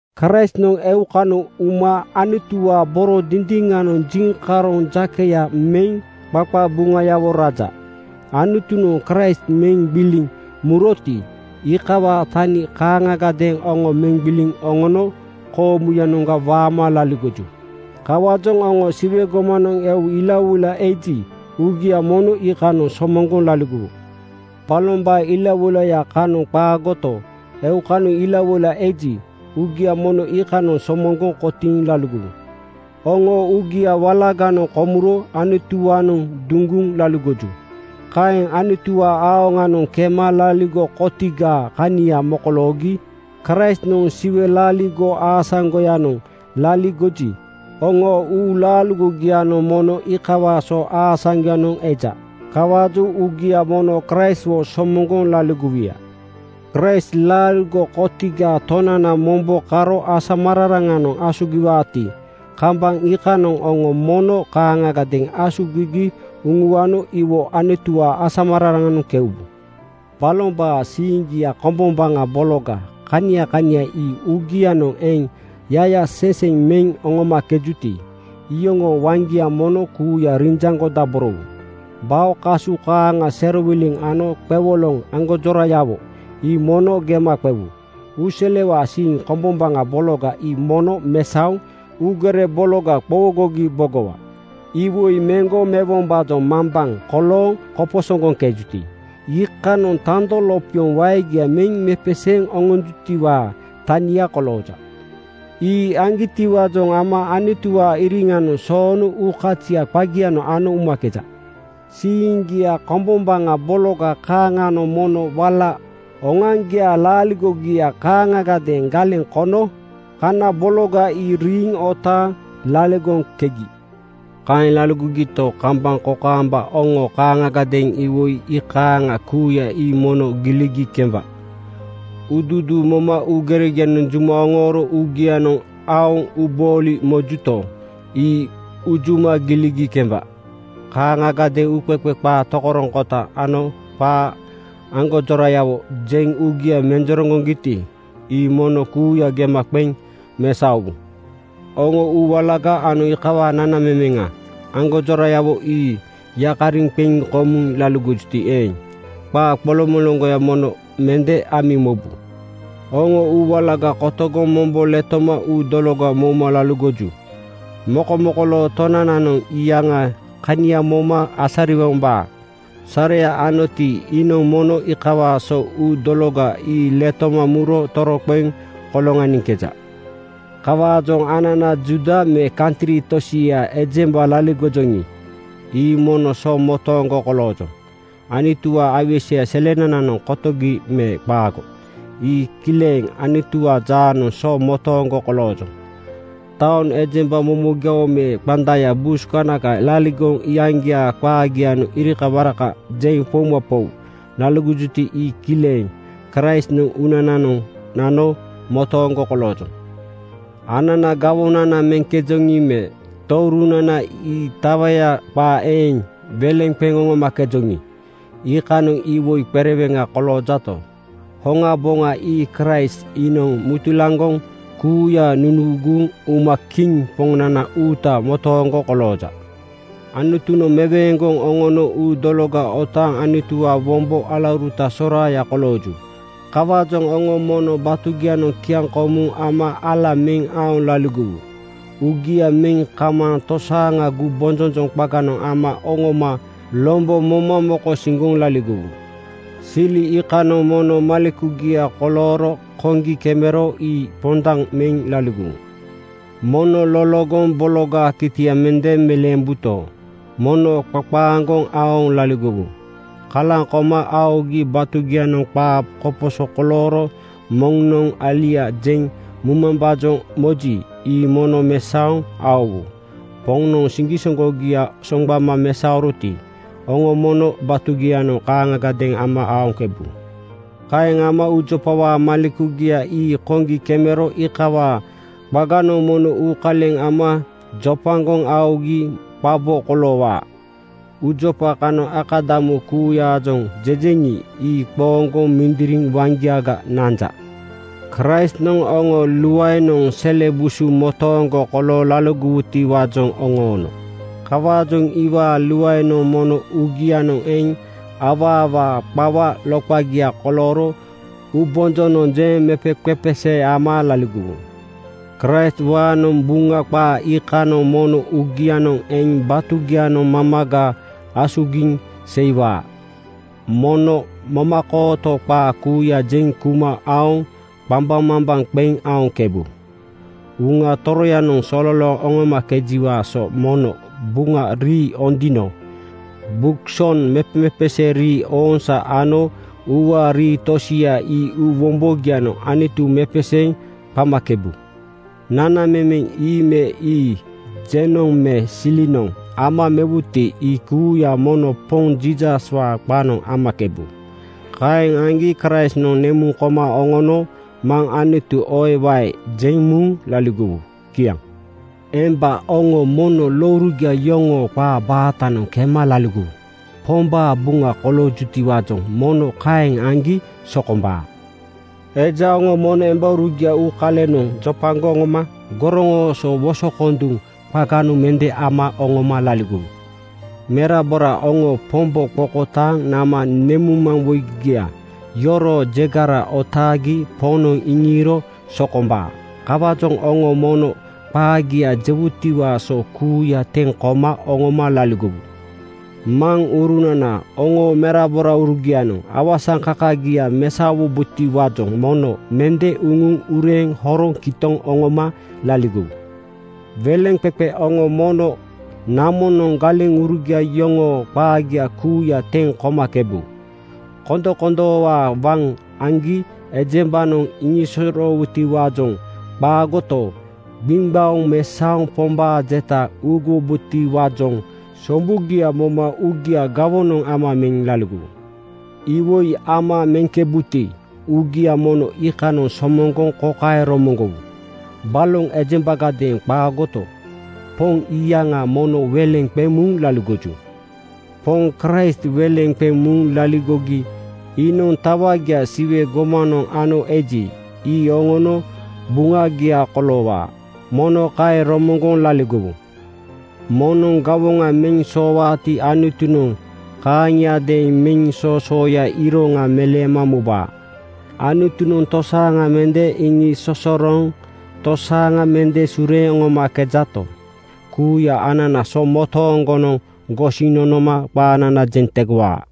Kraistnoŋ eukanoŋ uma Anutuwaa boro dindiŋanoŋ jiŋkaroŋ jakeya meŋ qaqabuŋayawo raja. Anutunoŋ Kraist meŋ gbiliŋ muroti, iikawaa tani kaaŋagadeeŋ oŋo meŋ gbiliŋ oŋono koomuyanoŋga waama laligoju. Kawaajoŋ oŋo Siwe gomanoŋ eu ilawoila eji, uugia mono iikanoŋ somoŋgoŋ laligowu. Balombaa ilawoilaya kanoŋ qaagoto, eukanoŋ ilawoila eji, uugia mono iikanoŋ somoŋgoŋ kotiiŋ laligowu. Oŋoo uugia walaganoŋ komuro Anutuwaanoŋ duŋgoŋ laligoju. Kaeŋ Anutuwaa aoŋanoŋ kema laaligo kotigaa kania mokoloogi. Kraistnoŋ Siwe laaligo aasaŋgoyanoŋ laligoji, oŋoo uulaaligogianoŋ mono iikawaa so aasaŋgoyanoŋ eja. Kawaajoŋ uugia mono Kraistwo somoŋgoŋ laligowuya. Kraist laaligo kotigaa Tonananoŋ mombo karo asamararaŋanoŋ asugiwaati, kambaŋ iikanoŋ oŋo mono kaaŋagadeeŋ asugigi uŋuano iwo Anutuwaa asamararaŋanoŋ keubu. Balombaa siiŋgia kombombaŋa bologa kania kania ii uugianoŋ eŋ yayaseseŋ meŋ oŋomakejuti, iyoŋoo waŋgia mono kuuya rinjaŋgodaborowu. Bao kasu kaaŋa serowiliŋ ano qewoloŋ aŋgonjorayawo ii mono gema qewu. Uuselewaa siiŋ kombombaŋa bologa ii mono mesaoŋ uugere bologa qowogogi bogowa. Iwoi meŋgo mewombaajoŋ mambaŋ kolooŋ koposoŋgoŋkejuti, iikanoŋ tando lopioŋ waegia meŋ mepeseeŋ oŋonjutiwaa tania kolooja. Ii aŋgitiwaajoŋ ama Anutuwaa iriŋanoŋ soono uukazia qagianoŋ ano umakeja. Siiŋgia kombombaŋa bologa kaaŋanoŋ mono wala oŋoaŋgiaa laaligogia kaaŋagadeeŋ galeŋ kono kana bologa ii riiŋ otaaŋ laligoŋkegi. Kaeŋ laligogito, kambaŋ kokaamba oŋo kaaŋagadeeŋ iwoi iikaaŋa kuuya ii mono giligi kemba: Uuduuduu moma uugeregianoŋ juma oŋooro uugianoŋ aoŋ uubooli mojuto, ii unjuma giligi kemba. Kaaŋagadeeŋ uuqeqe qaa tokoroŋkota ano qaa aŋgonjorayawo jeŋ uugia menjereŋgojuti ii mono kuuya gema qeŋ mesaowu. Oŋo uu walaga ano iikawaa nanamemeŋa aŋgonjora-yawo ii yakariŋ qeŋ komuŋ laligojuti eeŋ, qaa qoloŋmoloŋgoya mono mende amiŋ mobu. Oŋo uu walaga kotogoŋ mombo letoma uu dologa mouma laligoju. Mokomokoloo Tonananoŋ iyaŋaa kania moma asariwombaa sareya anoti iinoŋ mono iikawaa so uu dologa ii letoma muro toroqeŋ koloŋaniŋkeja. Kawaajoŋ anana Juuda me kantri tosiaa ejemba laligojoŋi, ii mono so motooŋgo koloojoŋ. Anutuwaa aiweseya selenananoŋ kotogi me qaago, ii kileŋ Anutuwaa jaanoŋ so motooŋgo koloojoŋ. Taoŋ ejemba momogiawo me qandaya (bus kanaka) laligoŋ iyaŋgiaa qaagianoŋ irikawaraka jeŋ poumapou laligojuti ii kileŋ Kraistnoŋ uunananoŋ nano motooŋgo koloojoŋ. Ananaa gawonana meŋkejoŋi me tourunana ii tawaya qaa eeŋ weleŋ qeŋ oŋomakejoŋi, iikanoŋ iwoi qereweŋa koloojato, hoŋaboŋa ii Kraist. Iinoŋ mutulaŋgoŋ kuuya nunuuguŋ uma Kiŋ Poŋnana uuta motooŋgo kolooja. Anutunoŋ meweeŋgoŋ oŋono uu dologa otaaŋ Anutuwaa wombo alauruta soraaya kolooju. Kawaajoŋ oŋo mono batugianoŋ kiaŋkomu ama ala meŋ aoŋ laligowu. Uugia meŋ kamaaŋ tosaaŋa gumbonjonjoŋ qaganoŋ ama oŋoma lombo moma mokosiŋgoŋ laligowu. Sili iikanoŋ mono malekugia kolooro koŋgi kemero ii pondaŋ meŋ laligowu. Mono loloŋgoŋ bologaa kitia mende meleembuto, mono qaqa-aŋgoŋ aoŋ laligowu. Kalaŋ koma aogi batugianoŋ qaa koposo kolooro moŋnoŋ alia jeŋ mumambaajoŋ moji, ii mono mesaoŋ aowu. Poŋnoŋ siŋgisoŋgogia soŋgbama mesaoroti, oŋo mono batugianoŋ kaaŋiadeeŋ ama aoŋkebu. Kaeŋ ama uujopawaa malekugia ii koŋgi kemero iikawaa qaganoŋ mono uukaleŋ ama jopagoŋ aogi qabo koloowaa. Uujopa kanoŋ akadamu kuuyaajoŋ jejeŋi, ii qooŋgoŋ mindiriŋ waŋgiaga nanja. Kraistnoŋ oŋo luaenoŋ sele busu motooŋgo kolooŋ laligowutiwaajoŋ oŋoono. Kawaajoŋ iwaa luaenoŋ mono uugianoŋ eŋ awaawaa qawa loqagia kolooro uubonjonoŋ jeŋ mepeqepesee ama laligowu. Kraistwaanoŋ Buŋa qaa iikanoŋ mono uugianoŋ eŋ batugianoŋ mamaga asugiŋ seiwaa. Mono momakooto qaa kuuya jeŋ kuma aoŋ qambaŋmambaŋ qeŋ aoŋkebu. Uŋa Toroyanoŋ sololooŋ oŋomakejiwaa so mono Buŋa Rii Ondino (Buk Song), mepemepesee rii (ooŋsaa) ano uuwaa rii tosia ii uu wombogianoŋ Anutu mepeseeŋ qamakebu. Nanamemeŋ ii me ii jenoŋ me silinoŋ ama mewuti ii kuuya mono Poŋ Jiisaswaa qanoŋ amakebu. Kaeŋ aŋgi Kraistnoŋ nemuŋ koma oŋono Maŋ Anutu oewae jeŋ muŋ laligowu. Kiaŋ. Emba oŋo mono lourugia yoŋoo qaa baatanoŋ kema laligowu. Pombaa buŋa koloojutiwaajoŋ mono kaeŋ aŋgi sokombaa. Eja oŋo mono embaurugia uukalenoŋ jopagoŋ oŋoma goroŋooso wosokonduŋ qaganoŋ mende ama oŋoma laligowu. Merabora oŋo Pombo qokotaaŋ nama nemuŋmaŋwoigia yoroo jegara otaagi Poŋnoŋ iŋiiro sokombaa. Kawaajoŋ oŋo mono qaagia jewutiwaa so kuuya teŋ koma oŋoma laligowu. Maŋurunana oŋoo meraboraurugianoŋ awasaŋkakagia mesaowubotiwaajoŋ mono mende uŋuŋ ureeŋ horoŋ kitoŋ oŋoma laligowu. Weleŋqeqe oŋo mono namonoŋ galeŋurugia yoŋoo qaagia kuuya teŋ komakebu. Kondokondoowaa waŋ aŋgi ejembanoŋ iŋisosoroowutiwaajoŋ qaagoto, gbiŋgbaoŋ mesaoŋ Pombaa jeta uuguwombotiwaajoŋ sombugia moma uugia gawonoŋ ama meŋ laligowu. Iwoi ama meŋkebuti uugia mono iikanoŋ somoŋgoŋ kokaeŋ romoŋgowu: Baloŋ ejembagadeeŋ qaagoto, Poŋ iyaŋa mono weleŋ qeŋ muŋ laligoju. Poŋ Kraist weleŋ qeŋ muŋ laligogi iinoŋ tawagia Siwe gomanoŋ ano eji, ii oŋono buŋagia koloowaa. Mono kaeŋ romoŋgoŋ laligowu. Moŋnoŋ gawoŋa meŋ soowaati Anutunoŋ kaaŋiadeeŋ meŋ soosooyaa iroŋa meleema mubaa. Anutunoŋ tosaaŋa mende iŋisosorooŋ tosaaŋa mende sureeŋ oŋomakejato, kuuya anana so motooŋgonoŋ gosiŋ nonoma qaanana jeŋ tegowaa.